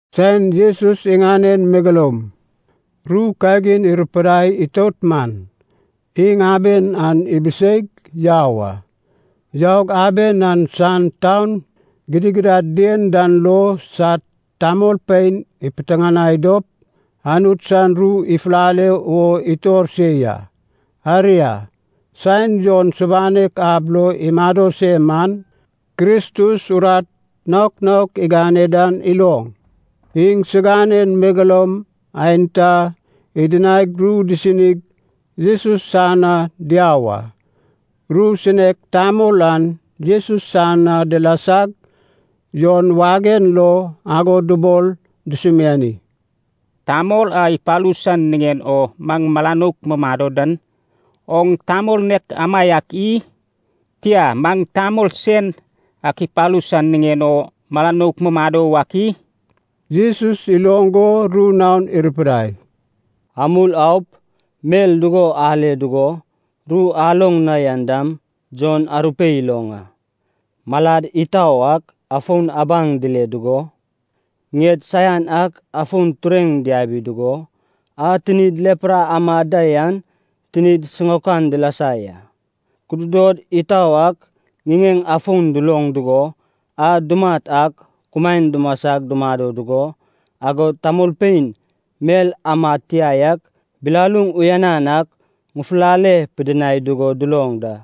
Saen Jesus iŋanen megeloum ru kagin irupidai itout man, iŋ aben an ibiseig yau a. Yaug aben an san taun gidigidad dien dan lo sad tamolpein ipiteŋanai dop Anut san ru ifulale wo itor se ya. Aria, saen Jon subanek ab lo imado se man, Kristus urat naok naok igane dan iloŋ, iŋsiganen megeloum aenta idinaig ru disinig Jesus san na diau a. Ru sinek tamol an Jesus san na dilasag Jon wagen lo ago dubol dusumiani, “Tamol a ipalu san niŋen o maŋ mala nouk mumado dan, oŋ tamol nek amaiak i? Tia, maŋ tamol sen ak ipalu san niŋen o mala nouk mumado wak i?” Jesus iloŋ go ru naon irupidai, “Amul aup mel dugo ale dugo, ru aloŋ na yan dam Jon arupeip iloŋ a: malad itau ak afon abaŋ dile dugo, ŋied saian ak afon tureŋ diabi dugo, a tinid lepra amad da yan tinid siŋaokan dilasa ya. Kududod itau ak ŋiŋeŋ afon duloŋ dugo, a dumat ak kumaen dumasag dumado dugo, agod tamolpein mel amad tia yak bilaluŋ uyanan ak ŋufulale pidinai dugo duloŋ da.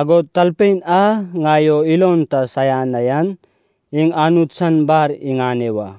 Agod talpein a ŋai o ilon ta saian na yan, iŋ Anut san bar iŋane wa.”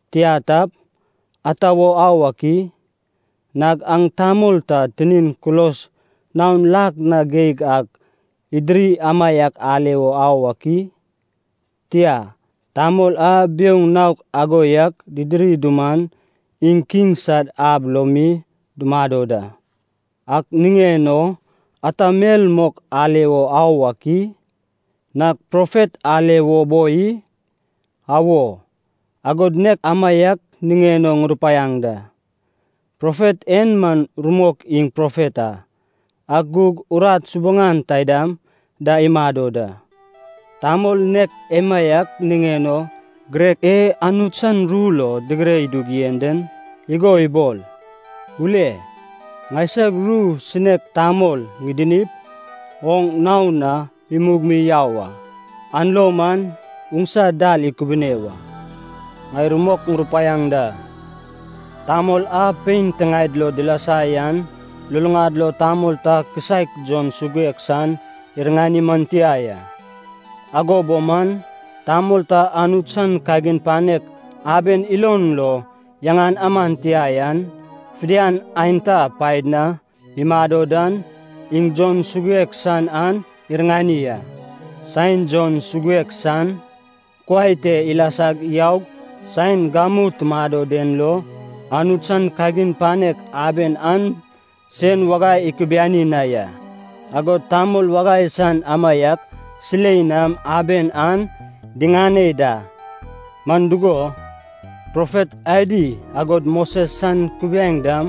Tia tap, ata wo au ak i? Nag aŋ tamol ta tinin kulos naon lak na geig ak idiri amaiak ale wo au ak i? Tia, tamol a biouŋ naok ago yak didiri duman, iŋ kiŋ sad ab lo mi dumado da. Ak niŋen o ata mel mok ale wo au ak i? Nag profet ale wo boi i? Awo, agod nek amaiak niŋen o ŋurupaiaŋ da, profet en man rumok iŋ profet a, ak gug urat subaŋan taidam da imado da, tamol nek emaiak niŋen o girek e Anut san ru lo digire idug yen den, igo ibol, ‘Ule, ŋaisag ru sinek tamol ŋidinip, oŋ nao na imug mi yau a. An lo man oŋsa dal ikubune wa.’ Ŋai rumok ŋurupaiaŋ da, tamol a pein tiŋaed lo dilasa yan luluŋad lo tamol ta kisaek Jon Suguek san iriŋani man tia ya. Ago bo man, tamol ta Anut san kagin panek aben ilon lo yaŋan aman tia yan, fidian aenta paed na imado dan, iŋ Jon Suguek san an iriŋani a. Saen Jon Suguek San kuai te ilasag yaug saen gamu tumado den lo, Anut san kagin panek aben an sen wagai ikubiani na ya, agod tamol wagai san amaiak silei nam aben an diŋane da. Man dugo, profet adi agod Moses san Kubiaeŋ dam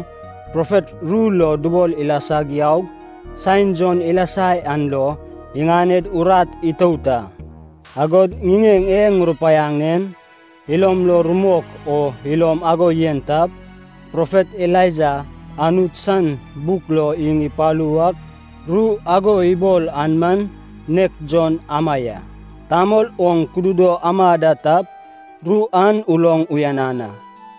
profet ru lo dubol ilasag yaug saen Jon ilasa yan lo iŋaned urat itout a. Agod ŋiŋeŋ e ŋurupaiaŋ en ilom lo rumok o ilom ago yen tap, profet Elaija Anut san buk lo iŋ ipalu wak ru ago ibol an man nek Jon ama ya. Tamol oŋ kududo ama da tap, ru an uloŋ uyanan a.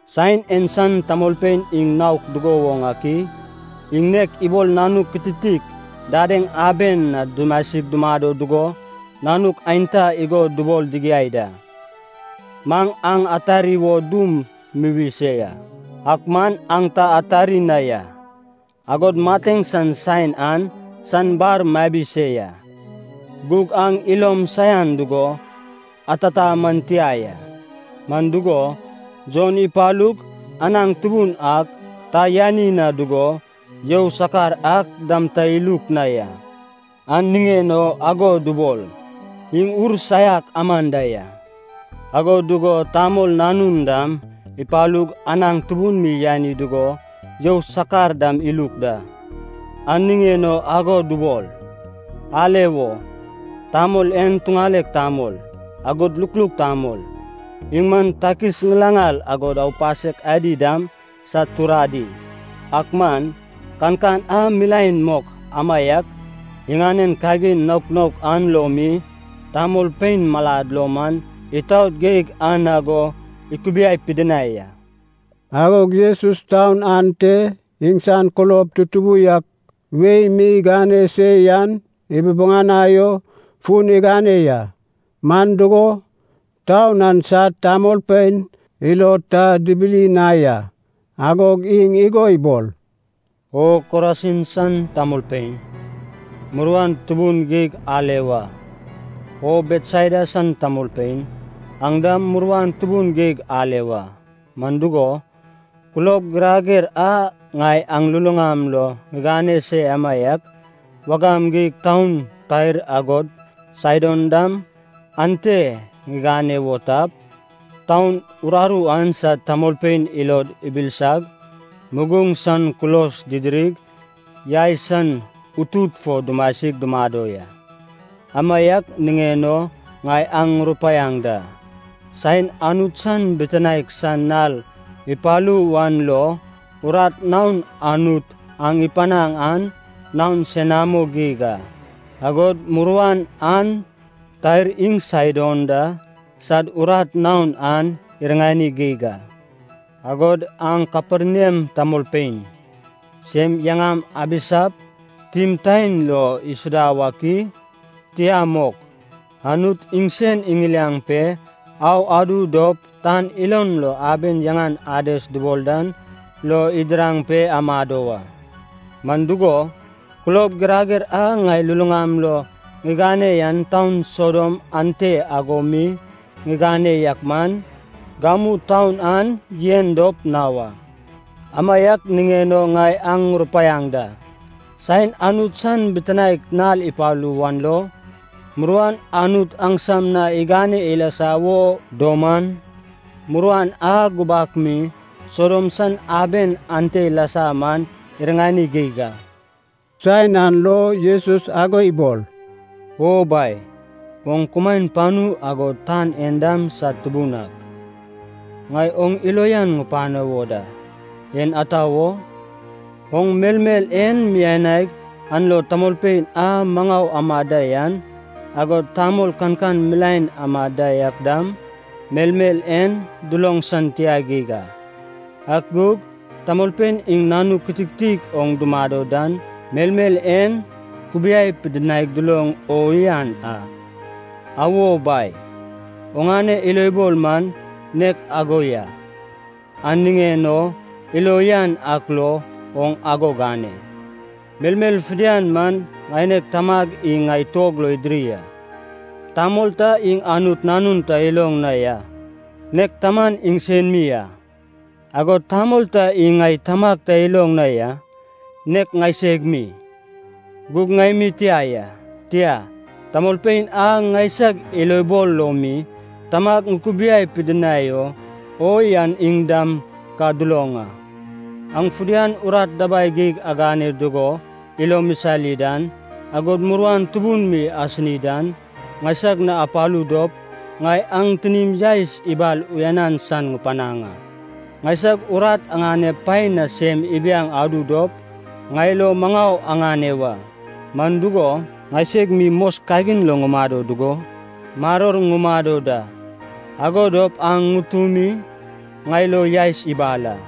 “Saen en san tamolpein iŋ naok dugo woŋ ak i? Iŋ nek ibol nanuk kititik dadeŋ aben na dumasig dumado dugo nanuk aenta igo dubol digiai da, ‘Maŋ aŋ atari wo dum muwi se ya, ak man aŋ ta atari na ya. Agod mateŋ san saen an san bar mabi se ya, gug aŋ ilom saian dugo atata man tia ya.’ Man dugo, Jon ipalug anaŋ tubun ak ta yani na dugo, you sakar ak dam ta iluk na ya, an niŋen o ago dubol, ‘iŋ ur saiak aman da ya.’ Ago dugo Tamol Nanun dam ipalug anaŋ tubun mi yani dugo you sakar dam iluk da, an niŋen o ago dubol, ‘Ale wo, tamol en tuŋalek tamol, agod lukluk tamol, iŋ man takis ŋilaŋal agod aupasek adi dam sad turadi!’ Ak man, kankan a milaen mok amaiak, iŋanen kagin naok naok an lo mi tamolpein malad lo man itaot geig an ago ikubiai pidinai a.” Agog Jesus taun ante iŋsan kulob tutubu yak wei mi igane se yan ibubuŋanai o fun igane ya, man dugo, taun an sad tamolpein ilod ta dibili na ya. Agog iŋ igo ibol, “O Korasin san tamolpein, muruan tubun geig ale wa; O Betsaida san tamolpein, aŋ dam muruan tubun geig ale wa. Man dugo, kulob girager a ŋai aŋ luluŋam lo ŋigane se amaiak, wagam geig taun Tair agod Saidon dam ante ŋigane wo tap, taun uraru an sad tamolpein ilod ibilsag, muguŋ san kulos didirig, yai san utut fo dumasig dumado ya. Amaiak niŋen o ŋai aŋ ŋurupaiaŋ da, saen Anut san bitinaek san nal ipalu wan lo, urat naon Anut aŋ ipanaŋ an naon senamo geig a, agod muruan an Tair iŋ Saidon da sad urat naon an iriŋani geig a. Agod aŋ Kaperniam tamolpein, sem yaŋam abisap timtaen lo isuda wak i? Tia mok, Anut iŋsen iŋiliaŋ pe au adu dop tan ilon lo aben yaŋan Ades dubol dan lo idiraŋ pe amado wa. Man dugo, kulob girager a ŋai luluŋam lo ŋigane yan taun Sodom ante ago mi ŋigane yak man, gamu taun an yen dop na wa. Amaiak niŋen o ŋai aŋ ŋurupaiaŋ da, saen Anut san bitinaek nal ipalu wan lo, muruan Anut aŋsam na igane ilasa wo duman, muruan a gubak mi Sodom san aben ante ilasa man iriŋani geig a.” Saen an lo Jesus ago ibol, “O Bai, oŋ kumaen panu agod tan en dam sad Tubun ak, ŋai oŋ ilo uyan ŋupano wo da, en ata wo? Oŋ melmel en mianaig an lo tamolpein a maŋau amad da yan, agod tamol kankan milaen amad da yak dam melmel en duloŋ san tia geig a. Ak gug tamolpein iŋ nanuk kititik oŋ dumado dan melmel en kubiai pidinaig duloŋ o uyanan a. Awo, Bai, oŋane ilobol man nek ago ya, an niŋen o ilo uyan ak lo oŋ ago gane. “Melmel fidian man ŋaineg Tamag iŋ ŋai tuog lo idiri a. Tamol ta iŋ Anut Nanun ta iloŋ na ya, nek Taman iŋsen mi a. Agod tamol ta iŋ ŋai Tamag ta iloŋ na ya, nek ŋaiseg mi, gug ŋai mi tia ya, tia, tamolpein a ŋaisag ilobol lo mi Tamag ŋukubiai pidinai o yan iŋ dam ka duloŋ a. “Aŋ fidian urat dabai geig agane dugo ilom isali dan, agod muruan tubun mi asini dan, ŋaisag na apalu dop, ŋai aŋ tinim yaes ibal uyanan san ŋupanaŋ a. Ŋaisag urat aŋanep paen na sem ibiaŋ adu dop, ŋai lo maŋau aŋane wa. Man dugo, ŋaiseg mi mos kagin lo ŋumado dugo maror ŋumado da. Ago dop aŋ ŋutumi ŋai lo yaes ibal a.”